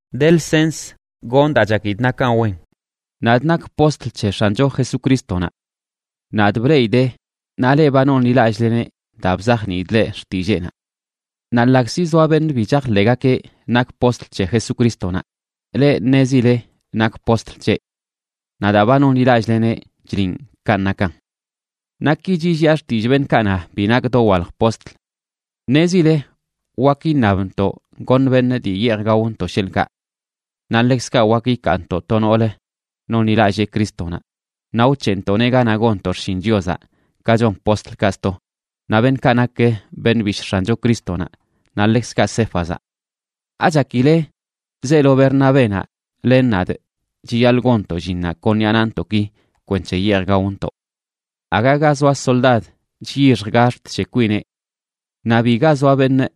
De lsens gonꞌ daa chakidꞌ nakan wen. Nadꞌ nakꞌ postl c̱he X̱ancho Jesucrístonaꞌ. Nadꞌ bleꞌidee, naꞌ leꞌ ba nonḻilallꞌleneꞌ daa bzajniidꞌ leꞌ xtilleenaꞌ. Naꞌ ḻaꞌkzi zoa beṉꞌ bi chajḻeꞌgakeꞌ nakꞌ postl c̱he Jesucrístonaꞌ, leꞌ ṉezile nakꞌ postl c̱heꞌ. Naꞌ daa ba nonḻilallꞌleneꞌ chliꞌn kanꞌ nakan. Naꞌ ki chilliꞌa xtillꞌ beṉꞌkaꞌ na bi nakꞌ dowalj postl: Ṉezile wak iṉabntoꞌ goṉ beṉꞌ dii yeej gaontoꞌ sheḻꞌkaꞌ. Naꞌ ḻekzkaꞌ wak ikaantoꞌ to noolə nonḻilallee Crístonaꞌ naꞌ wc̱heꞌntoꞌneꞌ ganaꞌ gonntoꞌ xshin Chiozaꞌ, ka chon postlkaꞌ sto, naꞌ beṉꞌkaꞌ nak beṉꞌ bishꞌ X̱ancho Crístonaꞌ, naꞌ ḻekzkaꞌ Céfazaꞌ.a ¿Achakile zeelo Bernabénaꞌ len nadꞌ chiyaḻꞌ gonntoꞌ llinnaꞌ kon ṉiꞌa naꞌntoꞌki kwenc̱he yeej gaontoꞌ? Aga ga zoa soldad chyixj gax̱t c̱he kwineꞌ. Naꞌ biga zoa beṉꞌ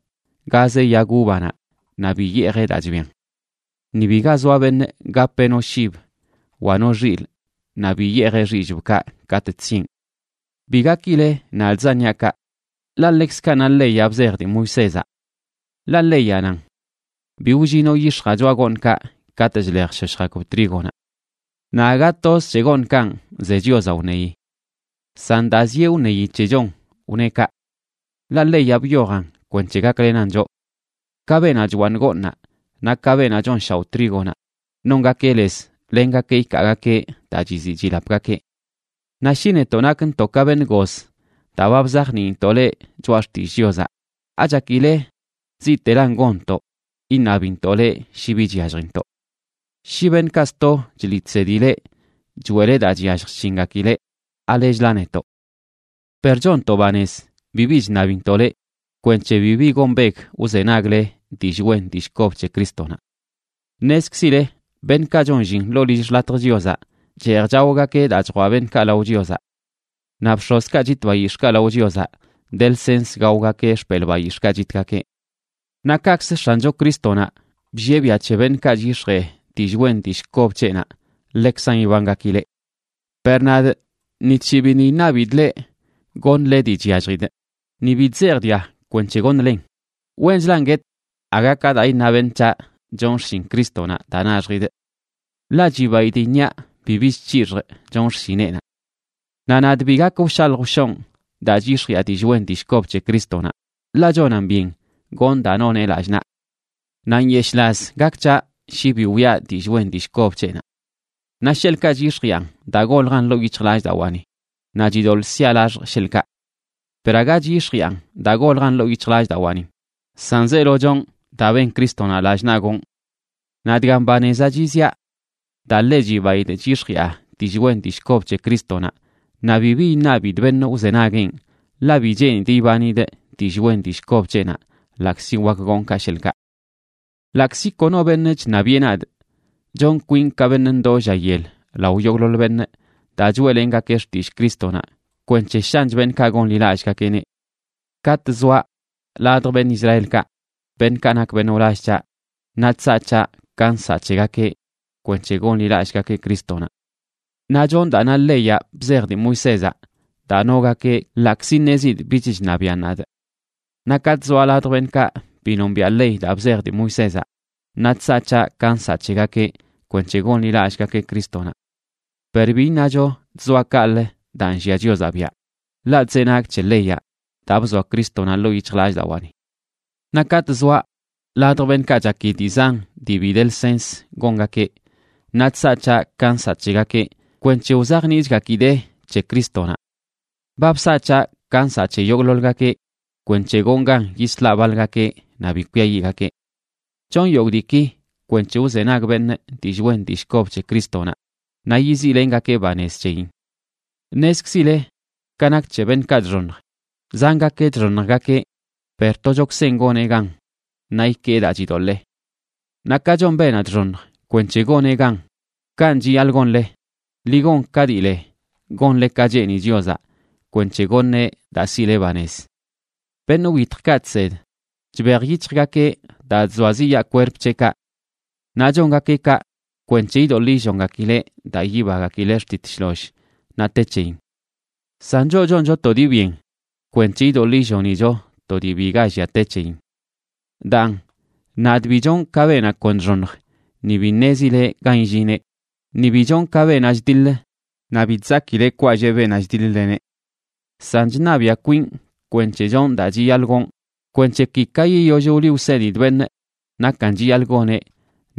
gazeꞌ yag uvanaꞌ naꞌ bi yeejeꞌ daa chbian. Ni biga zoa beṉꞌ gapeꞌ no shib wa no xilꞌ naꞌ bi yeejeꞌ xillꞌbkaꞌ katꞌ chsieꞌn. Bi gakile nadꞌzan niaꞌ kaꞌ, ḻaꞌ ḻekzkaꞌ na leyaꞌ bzej dii Moisézaꞌ. Ḻaꞌ leyaꞌ nan: “Bi wllinoꞌ yix̱jaꞌ choꞌa gooṉkaꞌ katꞌ chlej chshoshjgakb trígonaꞌ.” Naꞌ aga toz c̱he gooṉkanꞌ ze Chiozaꞌ wṉeyi. San daa zieꞌ wṉeyi c̱hechon wneꞌ kaꞌ. Ḻaꞌ leyaꞌ byojan kwenc̱he gaklenan choꞌ. Ka beenaꞌ chwaaṉ gooṉnaꞌ, naꞌ ka beenaꞌ chonshaoꞌ trígonaꞌ, nongakeꞌ lez lengakeꞌ ikaagakeꞌ daa chiziꞌ chilapgakeꞌ. Naꞌ shi netoꞌ nakntoꞌ ka beṉꞌ goz daa ba bzajniintoꞌ leꞌ choꞌa xtillꞌ Chiozaꞌ, ¿achakile ziꞌtelan gonntoꞌ iṉabintoꞌ leꞌ shi bi chyalljintoꞌ? Shi beṉꞌkaꞌ sto chliꞌ chsedi leꞌ choeꞌle daa chyallj chc̱hingakileꞌ, ¿alechla netoꞌ? Per chonntoꞌ banez bibi chṉabintoꞌ leꞌ kwenc̱he bibi gombeg wzenagle dillꞌ wen dillꞌ kob c̱he Crístonaꞌ. Ṉezkzile beṉꞌkaꞌ chon llin ḻoo lill xḻatj Chiozaꞌ cheej chaogakeꞌ daa chjwaꞌ beṉꞌkaꞌ lao Chiozaꞌ. Naꞌ bx̱ozkaꞌ chit bayix̱ꞌkaꞌ lao Chiozaꞌ de lsens gaogakeꞌ xpelꞌ bayix̱ꞌkaꞌ chitgakeꞌ. Naꞌ kaꞌkzə X̱ancho Crístonaꞌ bllieꞌ biaꞌ c̱he beṉꞌkaꞌ chyix̱jee dillꞌ wen dillꞌ kob c̱heꞌnaꞌ, ḻekzan ibangakileꞌ. Per nadꞌ ni tshii biṉꞌ iṉabidꞌ leꞌ goṉle dii chyalljidꞌ, ni bi chzejꞌ dga kwenc̱he goṉlen. Wenchlan guetꞌ aga ka daa iṉa beṉꞌ c̱haꞌ chonꞌ xshin Crístonaꞌ daa naxjidꞌ. Ḻaꞌ chibaidꞌ iṉiaꞌ bibi chc̱hix̱jꞌ chonꞌ xshineꞌnaꞌ. Naꞌ nadꞌ bi gak wshalj wshonꞌ daa chyix̱jiꞌa dillꞌ wen dillꞌ kob c̱he Crístonaꞌ, ḻaꞌ chonan byen gonꞌ daa noneꞌ lallꞌ naꞌ. ¡Naꞌ nyeshꞌlaz gak c̱haꞌ shi bi wiꞌa dillꞌ wen dillꞌ kob c̱heꞌnaꞌ! Naꞌ sheḻꞌkaꞌ chyix̱jiꞌan daa goljan ḻoo yic̱hjlallꞌdawaani, naꞌ chidoḻꞌ siaꞌ laxjꞌ, sheḻꞌkaꞌ. Per aga chyix̱jiꞌan daa goljan ḻoo yic̱hjlallꞌdawaanin, san zeelo chonꞌ daa ben Crístonaꞌ lallꞌ naꞌ gonꞌ. Naꞌ dgan banezaꞌ chiziꞌa: daa ḻe chibaidꞌ chyix̱jiꞌa dillꞌ wen dillꞌ kob c̱he Crístonaꞌ naꞌ bibi iṉabidꞌ beṉꞌ wzenagueꞌn, ḻaꞌ bi cheenidꞌ ibanidꞌ dillꞌ wen dillꞌ kob c̱heꞌnaꞌ, ḻaꞌkzi wak gon kaꞌ, sheḻꞌkaꞌ. Ḻaꞌkzi kono beṉꞌ chṉabiꞌe nadꞌ, chon kwinꞌ ka beṉꞌ ndoo lla yel lao yogꞌḻoḻ beṉꞌ daa choeꞌlengakee xtillꞌ Crístonaꞌ, kwenc̱he shanch beṉꞌkaꞌ gonḻilallꞌgakeꞌneꞌ. Katꞌ zoaꞌ ladj beṉꞌ Israelkaꞌ, beṉꞌkaꞌ nak beṉꞌ wlall c̱haꞌ, naꞌ chsaꞌ c̱haꞌ ka nsaꞌ c̱hegakeꞌ kwenc̱he gonḻilallꞌgakeꞌ Crístonaꞌ. Naꞌ chonꞌ daa na leyaꞌ bzej dii Moisézaꞌ daa nogakeꞌ ḻaꞌkzi ṉezidꞌ bich chṉabiꞌan nadꞌ. Naꞌ katꞌ zoaꞌ ladj beṉꞌkaꞌ bi nombiaꞌ ley daa bzej dii Moisézaꞌ, naꞌ chsaꞌ c̱haꞌ ka nsaꞌ c̱hegakeꞌ kwenc̱he gonḻilallꞌgakeꞌ Crístonaꞌ. Per bi iṉacho chzoaꞌ kaꞌlə daa nllia Chiozaꞌ biaꞌ, ḻaꞌ chzenagꞌ c̱he leyaꞌ daa bzoa Crístonaꞌ ḻoo yic̱hjlallꞌdawaani. Naꞌ katꞌ zoaꞌ ladj beṉꞌkaꞌ chaki dii zan dii bi de lsens gongakeꞌ, naꞌ chsaꞌ c̱haꞌ ka nsaꞌ c̱hegakeꞌ kwenc̱he wzajniꞌchgakidee c̱he Crístonaꞌ. Ba bsaꞌ c̱haꞌ ka nsaꞌ c̱he yogꞌḻoḻgakeꞌ kwenc̱he gonꞌ gan yislaꞌ baḻgakeꞌ naꞌ bi kwiayiꞌgakeꞌ. Chonꞌ yogꞌ diiki kwenc̱he wzenag beṉꞌ dillꞌ wen dillꞌ kob c̱he Crístonaꞌ naꞌ yiziꞌlengakee banez c̱heyin. Ṉezkzile ka nak c̱he beṉꞌkaꞌ chxoṉj, zangakeꞌ chxoṉjgakeꞌ, per tochokzenꞌ goneꞌ gan naꞌ ikee daa chidoḻee. Naꞌ ka chon beenaꞌ chxoṉj kwenc̱he goneꞌ gan, kanꞌ chiyaḻꞌ gonle, ḻi gon ka dii le gonle ka cheeni Chiozaꞌ kwenc̱he goṉeꞌ daa siꞌle banez. Beṉꞌ wyitjkaꞌ chsed, chbej yic̱hjgakeꞌ daa chzoaziꞌyaa kwerp c̱heꞌkaꞌ. Naꞌ chongakeꞌ kaꞌ kwenc̱he idoḻꞌ illongakileꞌ daa yibagakileꞌ xtit shloll naꞌ te c̱heyin. San choꞌ choncho to dii byen kwenc̱he idoḻꞌ illonicho to dii biga llia te c̱heyin. Daan, nadꞌ bi chonꞌ ka beenaꞌ kon chxoṉj ni bi ṉezileꞌ gan illineꞌ, ni bi chonꞌ ka beenaꞌ chdiḻ naꞌ bi chzakileꞌ kwalleꞌ beenaꞌ chdiḻ-leneꞌ. San chṉabiꞌa kwinꞌ kwenc̱he chonꞌ daa chiyaḻꞌ gonꞌ kwenc̱he ki, ka yiyoll wliꞌ wsedidꞌ beṉꞌ nakan chiyaḻꞌ goneꞌ,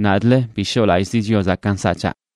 nadꞌlə bi shoꞌlallꞌzi Chiozaꞌ ka nsaꞌ c̱haꞌ.